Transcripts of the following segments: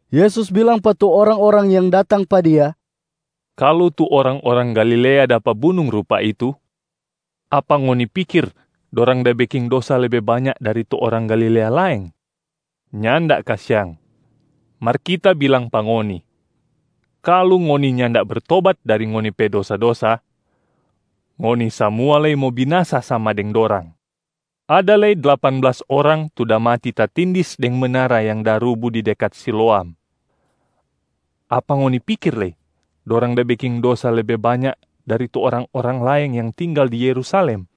Yesus bilang pa tu orang-orang yang datang pa Dia, “Kalu tu orang-orang Galilea dapa bunung rupa itu, apa ngoni pikir dorang da beking dosa lebe banya dari tu orang Galilea laeng? Nyanda kasiang! Mar Kita bilang pa ngoni, kalu ngoni nyanda bertobat dari ngoni pe dosa-dosa, ngoni samua lei mo binasa sama deng dorang. Ada lei dlapan blas orang tu da mati tatindis deng menara yang da rubu di dekat Siloam. Apa ngoni pikir lei dorang da beking dosa lebe banya dari tu orang-orang laeng yang tinggal di Yerusalem?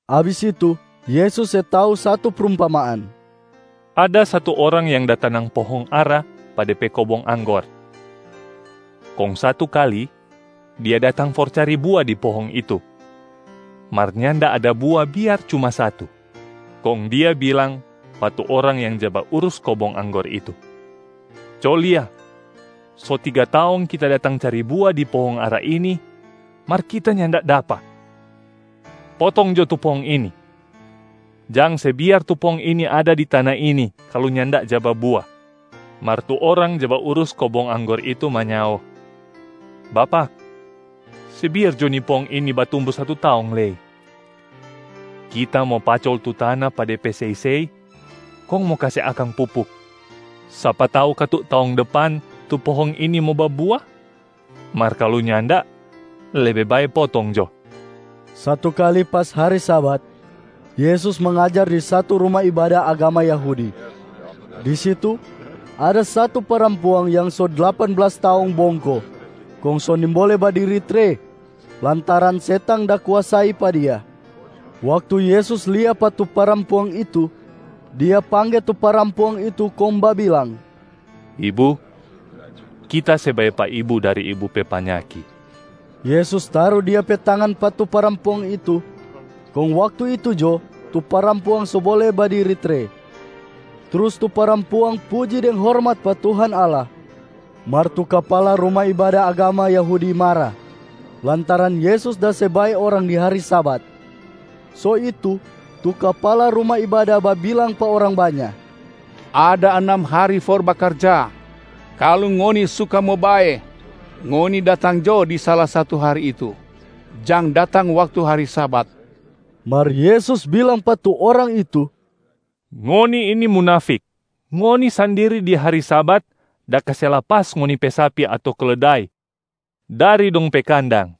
Abis itu Yesus se tau satu prumpamaan, “Ada satu orang yang da tanang pohong ara pa de pe kobong anggor. Kong satu kali dia datang for cari bua di pohong itu, mar nyanda ada bua biar cuma satu. Kong dia bilang pa tu orang yang ja baurus kobong anggor itu, ‘Co lia, so tiga taong kita datang cari bua di pohong ara ini mar kita nyanda dapa. Potong jo tu pohong ini! Jang se biar tu pohong ini ada di tana ini kalu nyanda ja babua!’ Mar tu orang ja baurus kobong anggor itu manyao, ‘Bapak, se biar jo ni pohong ini batumbu satu taong lei. Kita mo pacol tu tana pa de pe sei-sei kong mo kase akang pupuk. Sapa tau katu taong depan tu pohong ini mo babua, mar kalu nyanda, lebe bae potong jo.’” Satu kali pas hari Sabat, Yesus mangajar di satu ruma ibada agama Yahudi. Di situ ada satu parampuang yang so dlapan blas taong bongko kong so nimbole badiri tre lantaran setang da kuasai pa dia. Waktu Yesus lia pa tu parampuang itu, Dia pangge tu parampuang itu kong babilang, “Ibu, Kita se bae pa ibu dari ibu pe panyaki.” Yesus taru Dia pe tangan pa tu parampuang itu, kong waktu itu jo tu parampuang so bole badiri tre. Trus tu parampuang puji deng hormat pa Tuhan Allah. Mar tu kapala ruma ibada agama Yahudi mara lantaran Yesus da se bae orang di hari Sabat. So itu tu kapala ruma ibada babilang pa orang banya, “Ada anam hari for bakarja. Kalu ngoni suka mo bae, ngoni datang jo di sala satu hari itu, jang datang waktu hari Sabat.” Mar Yesus bilang pa tu orang itu, “Ngoni ini munafik! Ngoni sandiri di hari Sabat da kase lapas ngoni pe sapi ato keledai dari dong pe kandang,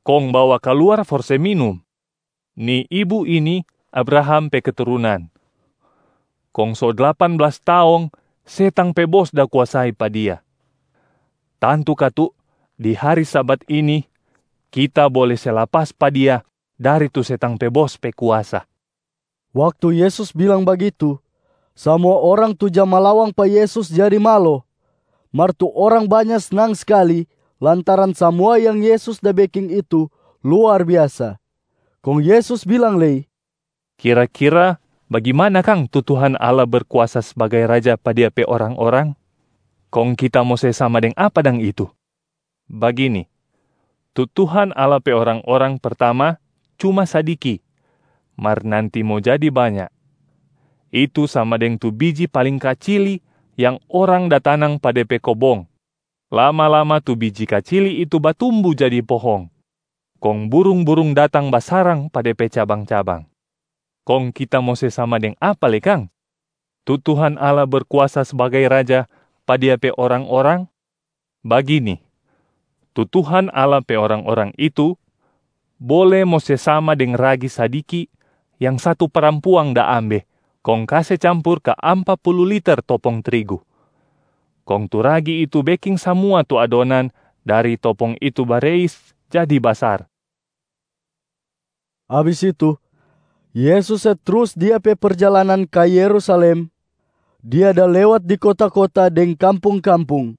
kong bawa kaluar for se minum. Ni ibu ini Abraham pe keturunan, kong so dlapan blas taong setang pe bos da kuasai pa dia. Tantu katu di hari Sabat ini Kita bole se lapas pa dia dari tu setang pe bos pe kuasa.” Waktu Yesus bilang bagitu, samua orang tu ja malawang pa Yesus jadi malo, mar tu orang banya snang skali lantaran samua yang Yesus da beking itu luar biasa. Kong Yesus bilang lei, “Kira-kira bagimana kang tu Tuhan Allah berkuasa sbagai Raja pa Dia pe orang-orang? Kong Kita mo se sama deng apa dang itu? Bagini, tu Tuhan Allah pe orang-orang pertama cuma sadiki mar nanti mo jadi banya, itu sama deng tu biji paling kacili yang orang da tanang pa de pe kobong. Lama-lama tu biji kacili itu batumbu jadi pohong, kong burung-burung datang basarang pa de pe cabang-cabang. Kong Kita mo se sama deng apa lei kang tu Tuhan Allah Berkuasa sbagai Raja pa Dia pe orang-orang? Bagini, tu Tuhan Allah pe orang-orang itu bole mo se sama deng ragi sadiki yang satu parampuang da ambe kong kase campur ka ampa pulu liter topong trigu, kong tu ragi itu beking samua tu adonan dari topong itu bareis jadi basar.” Abis itu, Yesus se trus Dia pe perjalanan ka Yerusalem. Dia da lewat di kota-kota deng kampung-kampung,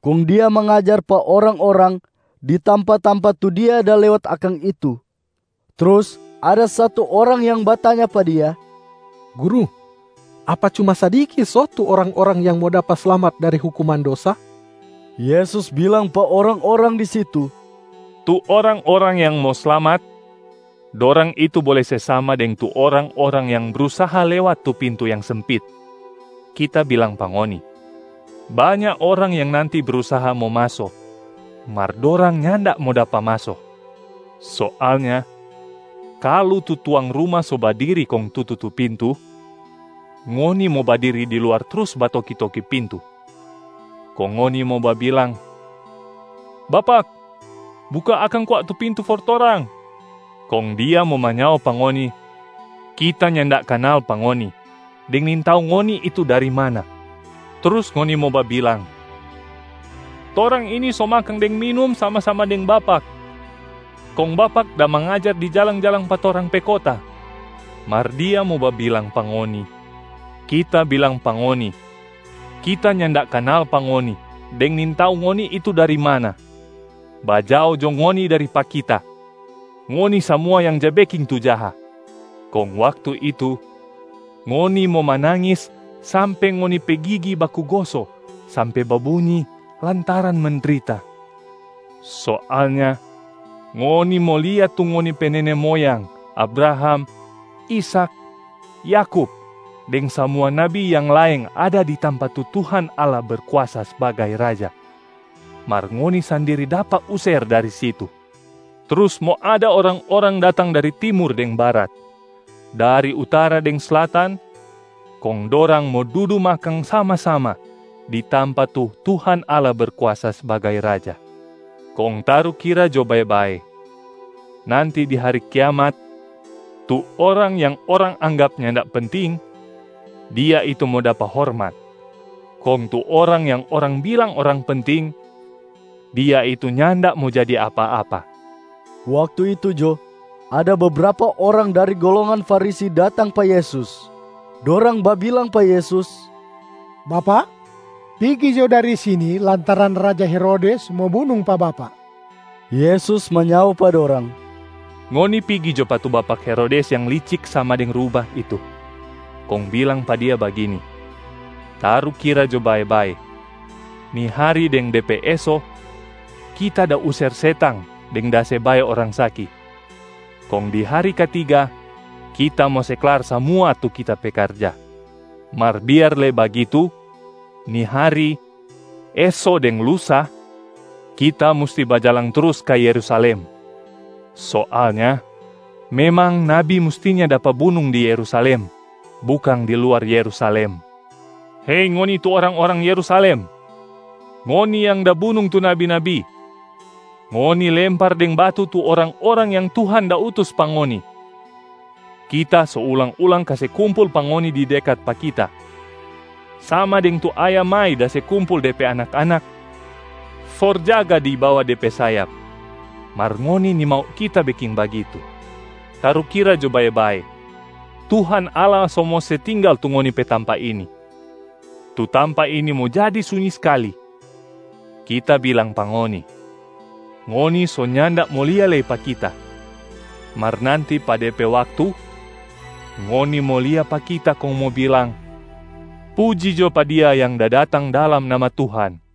kong Dia mangajar pa orang-orang di tampa-tampa tu Dia da lewat akang itu. Trus ada satu orang yang batanya pa Dia, “Guru, apa cuma sadiki so tu orang-orang yang mo dapa slamat dari hukuman dosa?” Yesus bilang pa orang-orang di situ, “Tu orang-orang yang mo slamat, dorang itu bole se sama deng tu orang-orang yang brusaha lewat tu pintu yang sempit! Kita bilang pa ngoni, banya orang yang nanti brusaha mo maso, mar dorang nyanda mo dapa maso. Soalnya kalu tu tuang ruma so badiri kong tutu tu pintu, ngoni mo badiri di luar trus batoki-toki pintu. Kong ngoni mo babilang, ‘Bapak, buka akang kwa tu pintu for torang!’ Kong dia mo manyao pa ngoni, ‘Kita nyanda kanal pa ngoni deng nintau ngoni itu dari mana.’ Trus ngoni mo babilang, ‘Torang ini so makang deng minum sama-sama deng Bapak, kong Bapak da mangajar di jalang-jalang pa torang pe kota.’ Mar Dia mo babilang pa ngoni, ‘Kita bilang pa ngoni, Kita nyanda kanal pa ngoni deng nintau ngoni itu dari mana. Bajao jo ngoni dari pa Kita, ngoni samua yang ja beking tu jaha.’ Kong waktu itu, ngoni mo manangis sampe ngoni pe gigi baku goso sampe babunyi lantaran mendrita. Soalnya ngoni mo lia tu ngoni pe nene moyang Abraham, Ishak, Yakub deng samua nabi yang laeng ada di tampa tu Tuhan Allah Berkuasa sbagai Raja, mar ngoni sandiri dapa user dari situ. Trus mo ada orang-orang datang dari timur deng barat, dari utara deng slatan, kong dorang mo dudu makang sama-sama di tampa tu Tuhan Allah Berkuasa sbagai Raja. Kong tarukira jo bae-bae, nanti di hari kiamat, tu orang yang orang anggap nyanda penting, dia itu mo dapa hormat, kong tu orang yang orang bilang orang penting, dia itu nyanda mo jadi apa-apa.” Waktu itu jo, ada bebrapa orang dari golongan Farisi datang pa Yesus. Dorang babilang pa Yesus, “Bapak, pigi jo dari sini lantaran raja Herodes mo bunung pa Bapak.” Yesus manyao pa dorang, “Ngoni pigi jo pa tu bapak Herodes yang licik sama deng rubah itu, kong bilang pa dia bagini, ‘Tarukira jo bae-bae, ni hari deng de pe eso Kita da user setang deng da se bae orang saki, kong di hari katiga Kita mo se klar samua tu Kita pe karja.’ Mar biar lei bagitu, ni hari, eso deng lusa, Kita musti bajalang trus ka Yerusalem. Soalnya memang nabi mustinya dapa bunung di Yerusalem, bukang di luar Yerusalem. Hei ngoni tu orang-orang Yerusalem! Ngoni yang da bunung tu nabi-nabi, ngoni lempar deng batu tu orang-orang yang Tuhan da utus pa ngoni. Kita so ulang-ulang kase kumpul pa ngoni di dekat pa Kita, sama deng tu ayam mai da se kumpul de pe anak-anak for jaga di bawa de pe sayap, mar ngoni nimau Kita beking bagitu. Tarukira jo bae-bae, Tuhan Allah so mo se tinggal tu ngoni pe tampaa ini, tu tampa ini mo jadi sunyi skali. Kita bilang pa ngoni, ngoni so nyanda mo lia lei pa Kita, mar nanti pa de pe waktu, ngoni mo lia pa Kita kong mo bilang, ‘Puji jo pa Dia yang da datang dalam nama Tuhan.’”